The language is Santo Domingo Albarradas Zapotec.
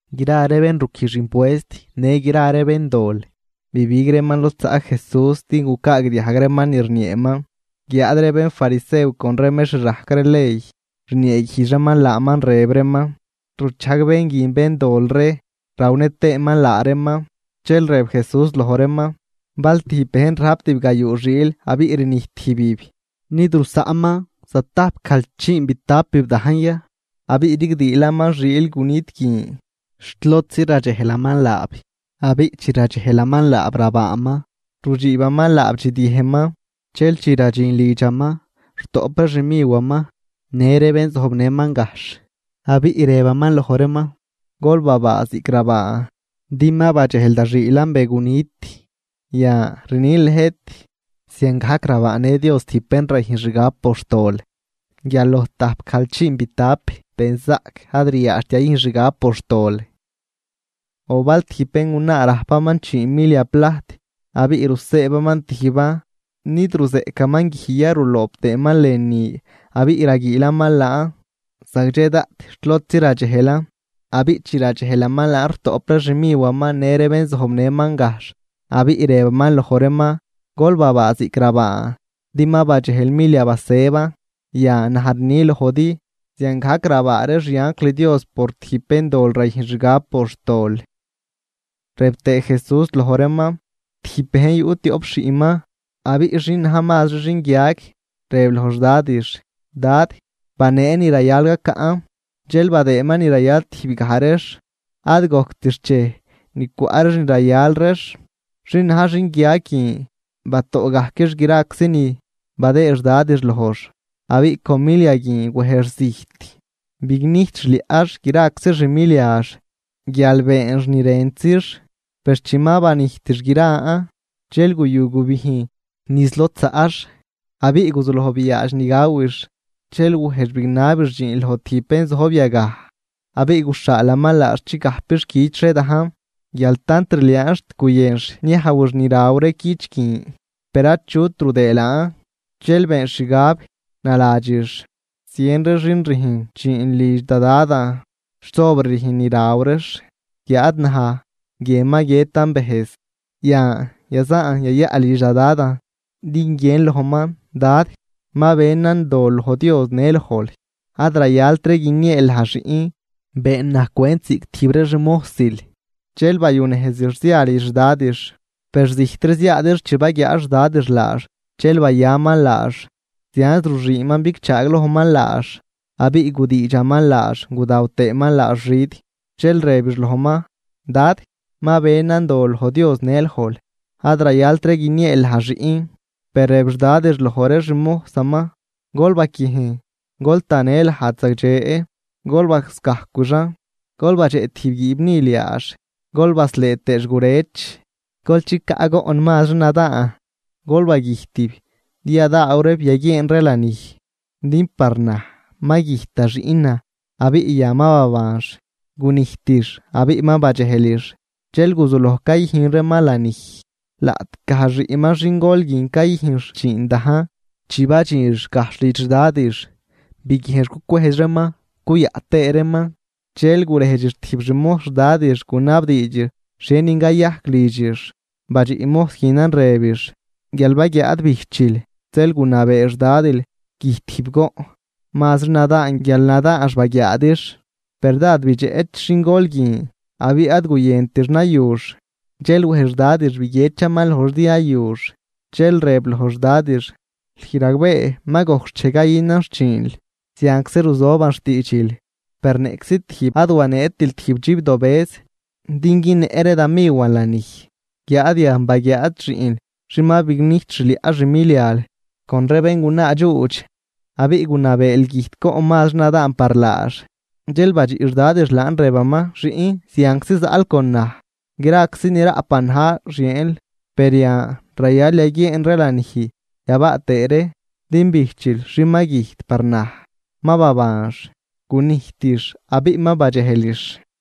Gra ree bén ruquijx impuest në gra ree béndol, bibig reeman lod zaꞌ Jesús din gucaagdiajg reeman ni rnieeman. Guiáad ree bénfarisew con ree mextr rajc ley rnieeguijdx reeman laaman, rëb reeman: ―Ruchajg bén guin béndol ree rawnë tëëman laa reeman. Dxel rëb Jesús loj reeman: ―Bal tijb bejn rajp tibgayuu xiil abiꞌ rnijt tijbib, ¿nid rusaꞌnman zatajpgajlchiinbitapib dajn ya abiꞌ rigdiilaman xiil gunit guin xt lodzi radxejlaman laab? Abiꞌ chi radxejlaman laab rabaaman, rudxiibaman laab dxidyëjnman. Dxel chi radxin lidxaman, rutoꞌp ree xmiwaman në ree bén zojbnëman gajxh abiꞌ rëbaman loj reeman: “Gol babaa ziꞌc rabaan, din ma badxejlan da xiilan be gunit.” Yan, rnin lëjt, ziangajc rabaanë Dios tijb bén rayüjn xgab por xtol guial loj tajpgajlchiinbitap benzaꞌc ad ryaadxt yayüjn xgab por xtol. ’O bal tijb béngunaa rajpaman chii milia plajt abiꞌ rusëëbaman tijban, ¿nid ruzeꞌcaman guij ya ruloob tëëman lënü abiꞌ raguiilaman laan zagdxe daꞌt xt lodzi radxejlan? Abiꞌ chi radxejlaman laan, rutoꞌp ree xmiwaman në ree bén zojbnëman gajxh, abiꞌ rëbaman loj reeman: “Gol babaa ziꞌc rabaan din ma badxejlan milia basëban.” Yan, naj rni lojdi, ziangajc rabaa ree xianjl Dios por tijb béndol rayüjn xgab por xtol. Rëb tëë Jesús loj reeman: ―Tijb bejn yuꞌ tioꞌp xiꞌnman. Abiꞌ xin na̱j mazri xinguiag, rëb loj xdadix: “Dad, banee ni rayal gacaꞌn.” Dxel badëëman ni rayal tijbgaj reex. Ad gojct xchej ni cwaꞌ reex ni rayal reex, xin na̱j xinguiag guin batoꞌgajquix graczi ni badëëd xdadix lojx, abiꞌ con milia guin wejx zijt bignijt xliaꞌx graczi xmiliax guial beenx ni rëntzix. Per chi ma banijtix gran, dxel guyu gubijn niz lod zaꞌx abiꞌ guzuloj biaadx ni gawix. Dxel wejx bignabix dxiin loj tijb bén zojb yagaj, abiꞌ guxhaalaman laax chigajpix cüch ree dajn. Guial tant rliaanx xt guyënx niajwix ni raw ree cüch guin, per achut rudëë laan. Dxel beenx xgab naladxix: “¡Zien ree xin rüjn dxiin lidx da Dadan xt sobr rüjn ni raw reex, guiáad naj guie ma guiëtan bëjz! Yan, yazaan yayaꞌ lidx da dadan din guiën lojman: Dad, ma benan dol loj Dios në lojl. Ad rayaltri guinieel naj xiꞌn; been naj cwent ziꞌc tijb ree xmojsil.” Dxel bayunejzix zia lidx xdadix. ’Per zijtri ziaadix chi baguiaa xdadix laax dxel bayaman laax, zianz ruxüünman bigchaaglojman laax, abiꞌ gudiidxaman laax gudaw tëëman laax xid. Dxel rëbix lojman: “Dad, ma benan dol loj Dios në lojl, ad rayaltri guinieel naj xiꞌn.” Per rëb xdadix loj ree xmojsaman: “Gol baquiejn gol tanë lajd zagdxe, gol bascajcwixan, gol badxeꞌ tijb guiibnil yaax gol baslëë tëëx gurëch, gol chicaꞌ goꞌn mazri nadaan, gol bagüjtib din yadaaw ree yaguieen ree lanij. Din par naj ma güjt da xiꞌnan abiꞌ yan ma babanx, gunijtix abiꞌ ma badxejlix.” Dxel guzuloj cayüjn reeman lanij. ’Laꞌtgaj xiꞌnman xingol guin cayüjnx dxiin dajn. Chi badxinx gajxh lidx xdadix, biguiejnx cucwejdx reeman cuyaꞌ tëë reeman. Dxel gurejdxix tijb xmojs xdadix, gunabdiidxix xhienin cayajc lidxix. Badxiꞌ mojs guinan rëbix: “Guial baguiaad bijchil zeel gunabee xdadil güjt tijb goꞌn mazri nadaan guial nadaanx baguiaadix.” Per dád bidxeꞌch xingol guin, abiꞌ ad guyëntix nayux. Zeel wej xdadix biguiedxaman lojx din yayux. Dxel rëb loj xdadix: “Lüj ragbee ma gojc xchej cayünan xchiinl, zianczi ruzoban xtiidxil; per niꞌczi tijb ad waneetil tijb dxibdobëz din günnëꞌ ree da miwan lanij. Guiáad yan baguiaad xiꞌnl, xin ma bignijt xliaꞌ xmilial con ree béngunaa dxuudx, abiꞌ gunabeel güjt goꞌn mazri nadaan par laax.” ’Dxel badxiꞌ xdadix laan rëbaman: “Xiꞌn, zianczi zaꞌl con naj, graczi ni raꞌpan na̱j xieenl. Per yan rayal yaguieen ree lanij yabaa tëë ree, din bijchil xin ma güjt par naj, ma babanx, gunijtix abiꞌ ma badxejlix.”